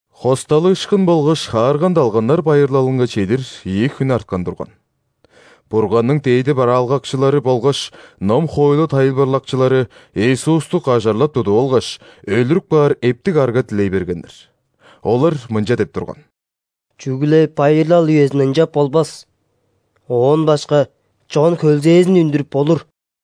·Хосталыышкын болгаш ·Хаарган далганнар байырлалынга чедир ийи хүн арткан турган. Бурганның дээди бараалгакчылары болгаш ном-хоойлу тайылбырлакчылары Иисусту кажарлап тудуп алгаш, өлүрүп каар эптиг арга дилей бергеннер. Олар мынча деп турган: «Чүгле байырлал үезинде ынчап болбас. Оон башка чон хөлзээзин үндүрүп болур».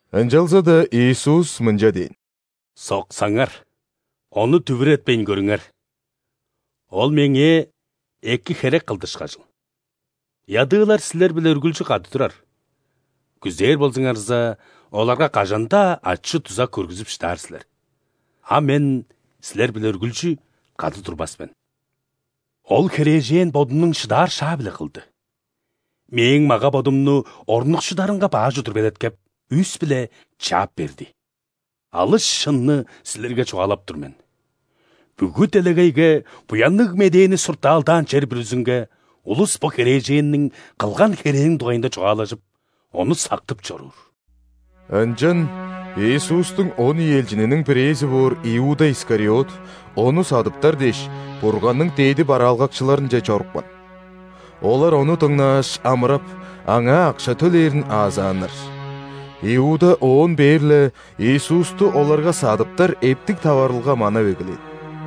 Ынчалза-даа Иисус мынча дээн: «Соксаңар, ону дүвүретпейн көрүңер. Ол Меңээ эки херек кылды ышкажыл. Ядыылар силер-биле үргүлчү кады турар, күзээр болзуңарза, оларга кажан-даа ачы-дуза көргүзүп шыдаар силер, а Мен силер-биле үргүлчү кады турбас мен. Ол херээжен бодунуң шыдаар шаа-биле кылды: Мээң мага-бодумну орнукшударынга баш удур белеткеп, үс-биле чаап берди. Алыс шынны силерге чугаалап тур мен: бүгү делегейге, Буянныг Медээни суртаалдаан чер бүрүзүнге, улус бо херээженниң кылган херээниң дугайында чугаалажып, ону сактып чоруур». Ынчан Иисустуң он ийи элчининиң бирээзи боор Иуда Искариот Ону садыптар дээш, Бурганның дээди бараалгакчыларынче чорупкан. Олар ону дыңнааш, амырап, аңаа акша төлээрин аазааннар. Иуда оон бээр-ле Иисусту оларга садыптар эптиг таварылга манап эгелээн.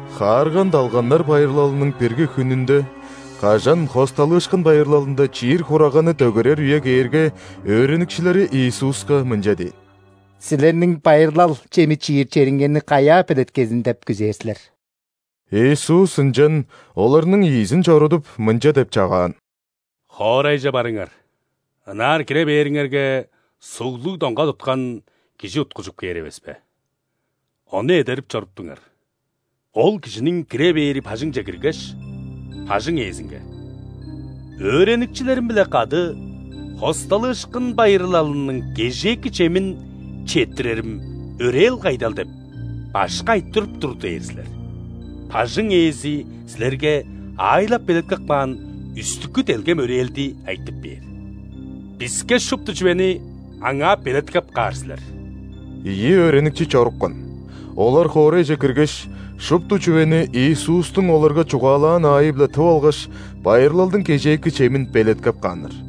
·Хаарган далганнар байырлалының бирги хүнүнде, кажан ·Хосталыышкын байырлалында чиир хураганны дөгерер үе кээрге, өөреникчилери Иисуска мынча дээн: «Силерниң байырлал чеми чиир чериңерни каяа белеткезин деп күзээр силер?» Иисус ынчан оларның ийизин чорудуп, мынча деп чагаан: «Хоорайже барыңар. Ынаар кире бээриңерге, суглуг доңга туткан кижи уткужуп кээр эвеспе. Ону эдерип чоруптуңар. Ол кижиниң кире бээри бажыңче киргеш, бажың ээзинге: „‘Өөреникчилерим-биле кады Хосталыышкын байырлалының кежээки чемин четтирерим өрээл кайдал?’ – деп, Башкы айтырып тур“ – дээр силер. Бажың ээзи силерге аайлап-белеткеп каан үстүкү делгем өрээлди айтып бээр. Биске шупту чүвени аңаа белеткеп каар силер». Ийи өөреникчи чорупкан. Олар хоорайже киргеш, шупту чүвени Иисустуң оларга чугаалаан аайы-биле тып алгаш, байырлалдың кежээки чемин белеткеп кааннар.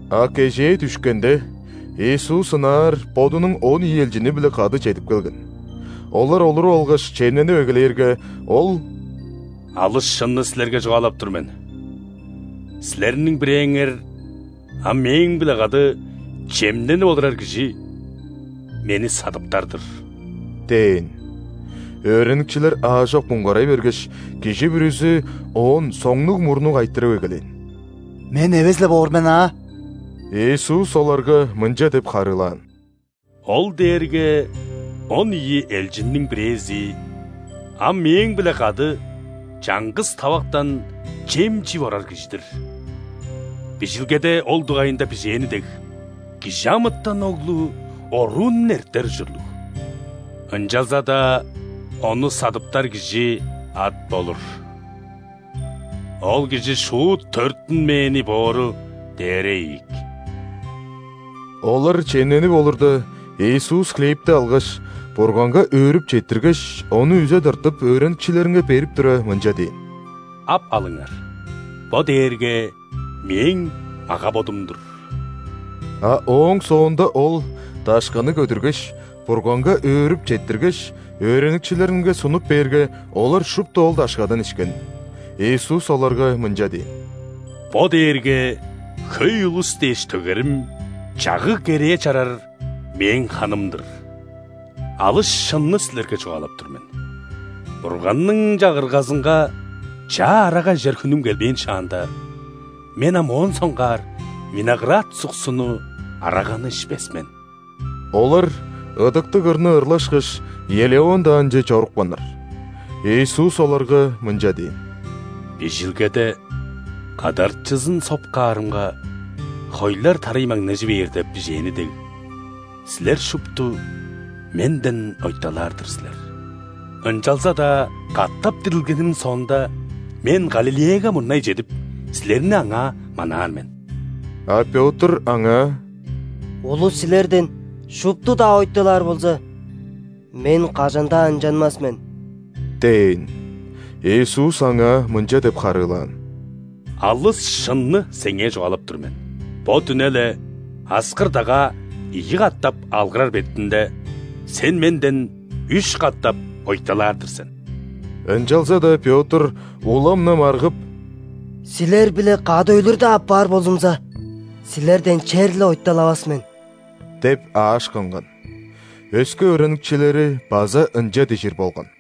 А кежээ дүшкенде, Иисус ынаар Бодунуң он ийи элчини-биле кады чедип келген. Олар олуруп алгаш, чемненип эгелээрге, Ол: «Алыс шынны силерге чугаалап тур мен: силерниң бирээңер – ам Мээң-биле кады чемненип олурар кижи – Мени садыптар-дыр» – дээн. Өөреникчилер аажок муңгарай бергеш, кижи бүрүзү Оон соңнуг-мурнуг айтырып эгелээн: «Мен эвес-ле боор мен аа?» Иисус оларга мынча деп харыылаан: «Ол дээрге он ийи элчинниң бирээзи, ам Мээң-биле кады чаңгыс тавактан чем чип орар кижи-дир. Бижилгеде ол дугайында бижээни дег, ·Кижи амытан Оглу оруун эртер ужурлуг, ынчалза-даа Ону садыптар кижи ат болур! Ол кижи шуут төрүттүнмээни боору дээре ийик!» Олар чемненип олурда, Иисус хлебти алгаш, Бурганга өөрүп четтиргеш, ону үзе тыртып, өөреникчилеринге берип тура, мынча дээн: «Ап алыңар, бо дээрге Мээң мага-бодум-дур». А ооң соонда Ол дашканы көдүргеш, Бурганга өөрүп четтиргеш, өөреникчилеринге сунуп бээрге, олар шупту ол дашкадан ишкен. Иисус оларга мынча дээн: «Бо дээрге хөй улус дээш төгерим, чагыг-керээ чарар Мээң ханым-дыр. Алыс шынны силерге чугаалап тур мен: Бурганның Чагыргазынга чаа арага ижер хүнүм келбээн шаанда, Мен ам моон соңгаар виноград суксуну – араганы ишпес мен». Олар ыдыктыг ырны ырлашкаш, Елеон даанче чорупканнар. Иисус оларга мынча дээн: «Бижилгеде: „Кадарчызын соп каарымга, хойлар тарай маңнажы бээр“ – деп бижээни дег, силер шупту Менден ойталаар-дыр силер. Ынчалза-даа катап дирилгеним соонда, Мен Галилеяга мурнай чедип, силерни аңаа манаар мен». А Пётр Аңаа: «Улус Силерден шупту-даа ойталаар болза, мен кажан-даа ынчанмас мен» – дээн. Иисус аңаа мынча деп харыылаан: «Алыс шынны сеңээ чугаалап тур мен: бо дүне-ле, аскыр-дагаа ийи катап алгырар бетинде, сен Менден үш катап ойталаар-дыр сен». Ынчалза-даа Пётр улам-на маргып: «Силер-биле кады өлүр-даа апаар болзумза, Силерден черле ойталавас мен!» – деп аашкынган. Өске өөреникчилери база ынча дижир болган.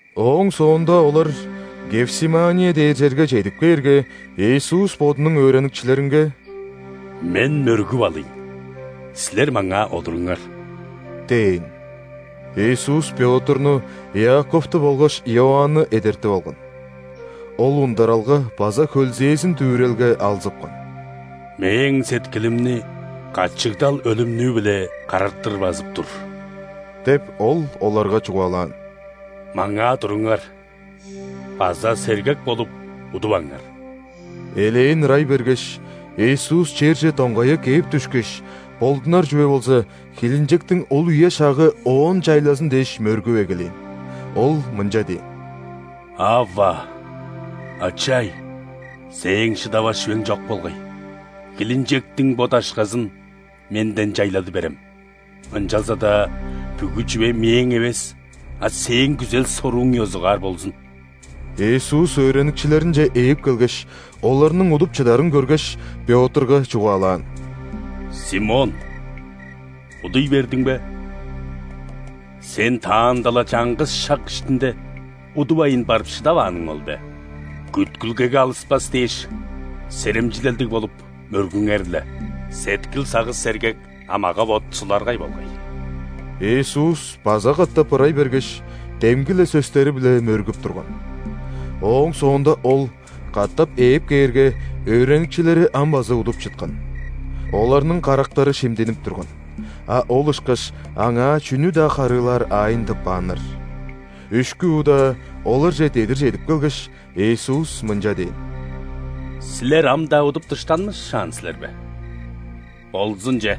Ооң соонда олар Гефсимания дээр черге чедип кээрге, Иисус Бодунуң өөреникчилеринге: «Мен мөргүп алыйн, силер маңаа олуруңар» – дээн. Иисус Пётрну, Иаковту болгаш Иоанны эдертип алган. Ол ундаралга база хөлзээзин-дүвүрелге алзыпкан. «Мээң сеткилимни качыгдал өлүмнүү-биле карартыр базып тур – деп, Ол оларга чугаалаан. – Маңаа туруңар база сергек болуп, удуваңар!» Элээн ырай бергеш, Иисус черже доңгая кээп дүшкеш, болдунар чүве болза, хилинчектиң ол үе-шагы Оон чайлазын дээш, мөргүп эгелээн. Ол мынча дээн: «Авва, Ачай! Сээң шыдавас чүвең чок болгай. Хилинчектиң бо дашказын Менден чайлады берем! Ынчалза-даа бүгү чүве Мээң эвес, а Сээң күзел-сорууң ёзугаар болзун». Иисус өөреникчилеринче ээп келгеш, оларның удуп чыдарын көргеш, Пётрга чугаалаан: «Симон, удуй бердиң бе? Сен таанда-ла чаңгыс шак иштинде удувайн барып шыдавааның ол бе? Күткүлгеге алыспас дээш, серемчилелдиг болуп, мөргүңер-ле. Сеткил-сагыш – сергек, а мага-бот – суларгай болгай». Иисус база катап ырай бергеш, демги-ле сөстери-биле мөргүп турган. Ооң соонда Ол катап ээп кээрге, өөреникчилери ам база удуп чыткан. Оларның карактары шимдинип турган, а ол ышкаш Аңаа чүнү-даа харыылаар аайын тыппааннар. Үшкү удаа оларже дедир чедип келгеш, Иисус мынча дээн: «Силер ам-даа удуп дыштанмышаан силер бе? Болзун че.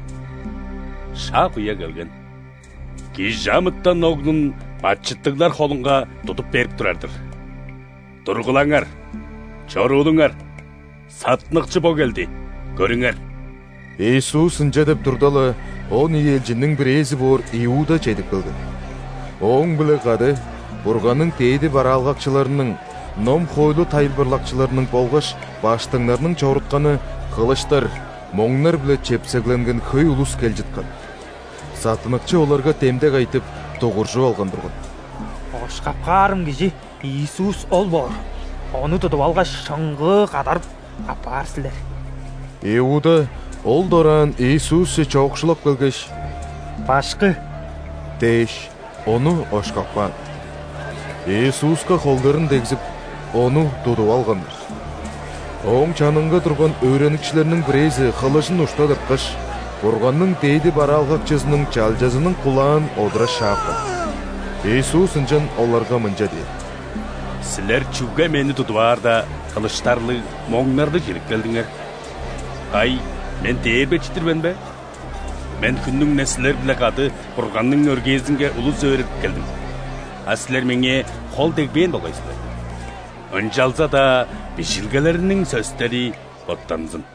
Шак-үе келген, ·Кижи амытан Оглун бачыттыглар холунга тудуп берип турар-дыр. Тургулаңар, чоруулуңар. Саттыныкчы бо келди, көрүңер!» Иисус ынча деп турда-ла, он ийи элчинниң бирээзи боор Иуда чедип келген. Ооң-биле кады Бурганның дээди бараалгакчыларының, ном-хоойлу тайылбырлакчыларының болгаш ·баштыңнарның чорутканы, хылыштар, моңнар-биле чепсегленген хөй улус кел чыткан. Саттыныкчы оларга демдек айтып, дугуржуп алган турган: «Ошкап каарым кижи Иисус ол боор. Ону тудуп алгаш, шыңгыы кадарып, аппаар силер». Иуда ол дораан Иисусче чоокшулап келгеш: «Башкы!» – дээш, Ону ошкап каан. Иисуска холдарын дегзип, Ону тудуп алганнар. Ооң чанынга турган өөреникчилерниң бирээзи хылыжын ушта тырткаш, Бурганның дээди бараалгакчызының чалчазының кулаан одура шаапкан. Иисус ынчан оларга мынча дээн: «Силер чүге Мени тудуп аарда, хылыштарлыг, моңнарлыг чедип келдиңер? Кай, Мен дээрбечи-дир мен бе? Мен хүннүң-не силер-биле кады Бурганның өргээзинге улус өөредип келдим, а силер Меңээ хол дегбээн болгай силер. Ынчалза-даа Бижилгелерниң сөстери боттанзын».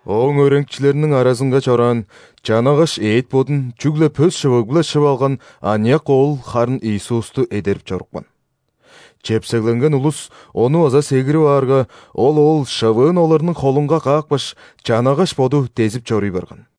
Ооң өөреникчилериниң аразынга чораан, чанагаш эът-бодун чүгле пөс шывыг-биле шып алган аныяк оол харын Иисусту эдерип чорупкан. Чепсегленген улус ону база сегирип аарга, ол оол шывыын оларның холунга каапкаш, чанагаш боду дезип чоруй барган.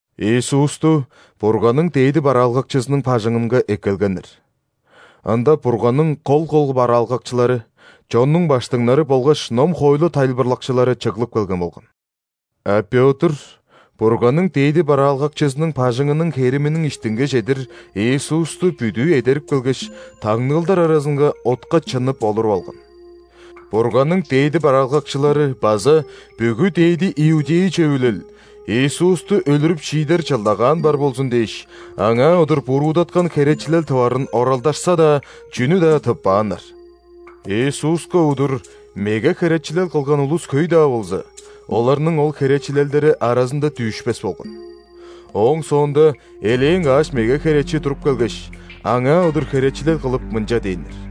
Иисусту Бурганның дээди бараалгакчызының бажыңынга эккелгеннер. Ында Бурганның кол-кол бараалгакчылары, чоннуң ·баштыңнары болгаш ном-хоойлу тайылбырлакчылары чыглып келген болган. (А Пётр Бурганның дээди бараалгакчызының бажыңының хериминиң иштинге чедир Иисусту бүдүү эдерип келгеш, таңныылдар аразынга отка чыннып олуруп алган.) Бурганның дээди бараалгакчылары база бүгү ·дээди иудей Чөвүлел Иисусту өлүрүп шиидер чылдагаан бар болзун дээш, Аңаа удур буруудаткан херечилел тыварын оралдашса-даа, чүнү-даа тыппааннар. Иисуска удур меге херечилел кылган улус хөй-даа болза, оларның ол херечилелдери аразында дүүшпес болган. Ооң соонда элээн каш меге херечи туруп келгеш, Аңаа удур херечилел кылып, мынча дээннер: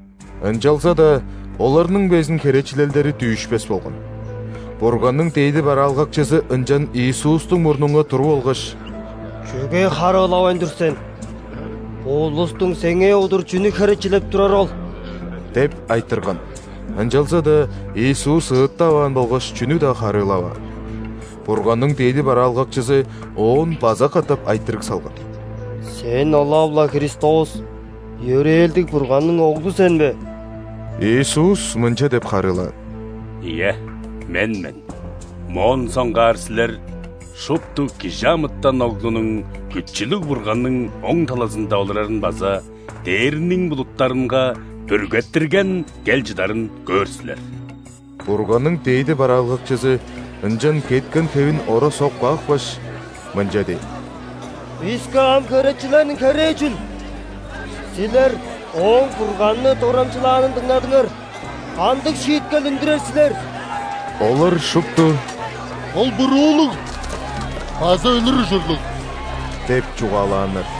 Ынчалза-даа оларның безин херечилелдери дүүшпес болган. Бурганның дээди бараалгакчызы ынчан Иисустуң мурнунга туруп алгаш: «Чүге харыылавайн тур сен? Бо улустуң сеңээ удур чүнү херечилеп турары ол?» – деп айтырган. Ынчалза-даа Иисус ыыттаваан болгаш чүнү-даа харыылаваан. Бурганның дээди бараалгакчызы Оон база катап айтырыг салган: «Сен ылап-ла Христос, йөрээлдиг Бурганның Оглу сен бе?» Иисус мынча деп харыылаан: «Ийе, Мен мен. Моон соңгаар силер шупту ·Кижи амытан Оглунуң Күчүлүг Бурганның оң талазында олурарын база дээрниң булуттарынга бүргеттирген кел чыдарын көөр силер». Бурганның дээди бараалгакчызы ынчан кеткен хевин ора соп каапкаш, мынча дээн: «Биске ам херечилерниң херээ чүл? Силер Ооң Бурганны дорамчылаанын дыңнадыңар. Кандыг шииткел үндүрер силер?» Олар шупту: «Ол буруулуг база өлүр ужурлуг» – деп чугаалааннар.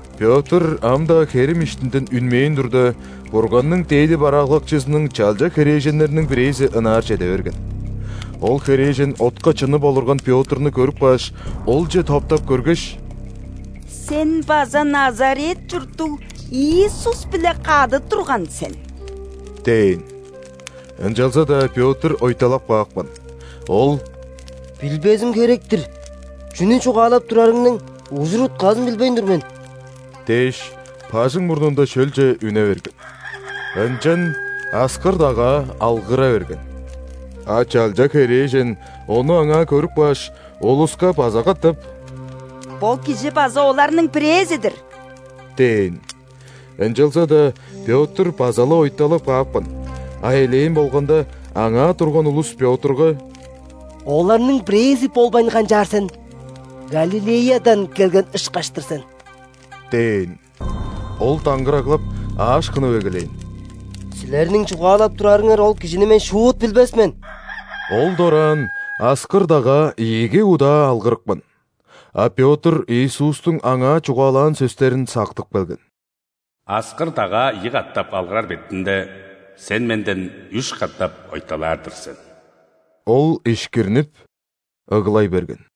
Пётр ам-даа херим иштинден үнмээн турда, Бурганның дээди бараалгакчызының чалча херээженнериниң бирээзи ынаар чеде берген. Ол херээжен отка чыннып олурган Пётрну көрүп кааш, олче топтап көргеш: «Сен база Назарет чурттуг Иисус-биле кады турган сен» – дээн. Ынчалза-даа Пётр ойталап каапкан. Ол: «Билбезим херек-тир, чүнү чугаалап турарыңның ужур-утказын билбейн тур мен» – дээш, бажың мурнунда шөлче үне берген. Ынчан аскыр-дагаа алгыра берген. А чалча херээжен ону аңаа көрүп кааш, улуска база катап: «Бо кижи база оларның бирээзи-дир» – дээн. Ынчалза-даа Пётр база-ла ойталап каапкан, а элээн болганда, аңаа турган улус Пётрга: «Оларның бирээзи болбайн канчаар сен, Галилеядан келген ышкаш-тыр сен» – дээн. Ол даңгыраглап, аашкынып эгелээн: «Силерниң чугаалап турарыңар ол Кижини мен шуут билбес мен». Ол дораан аскыр-дагаа ийиги удаа алгырыпкан, а Пётр Иисустуң аңаа чугаалаан сөстерин сактып келген: «Аскыр-дагаа ийи катап алгырар бетинде, сен Менден үш катап ойталаар-дыр сен». Ол ишкирнип ыглай берген.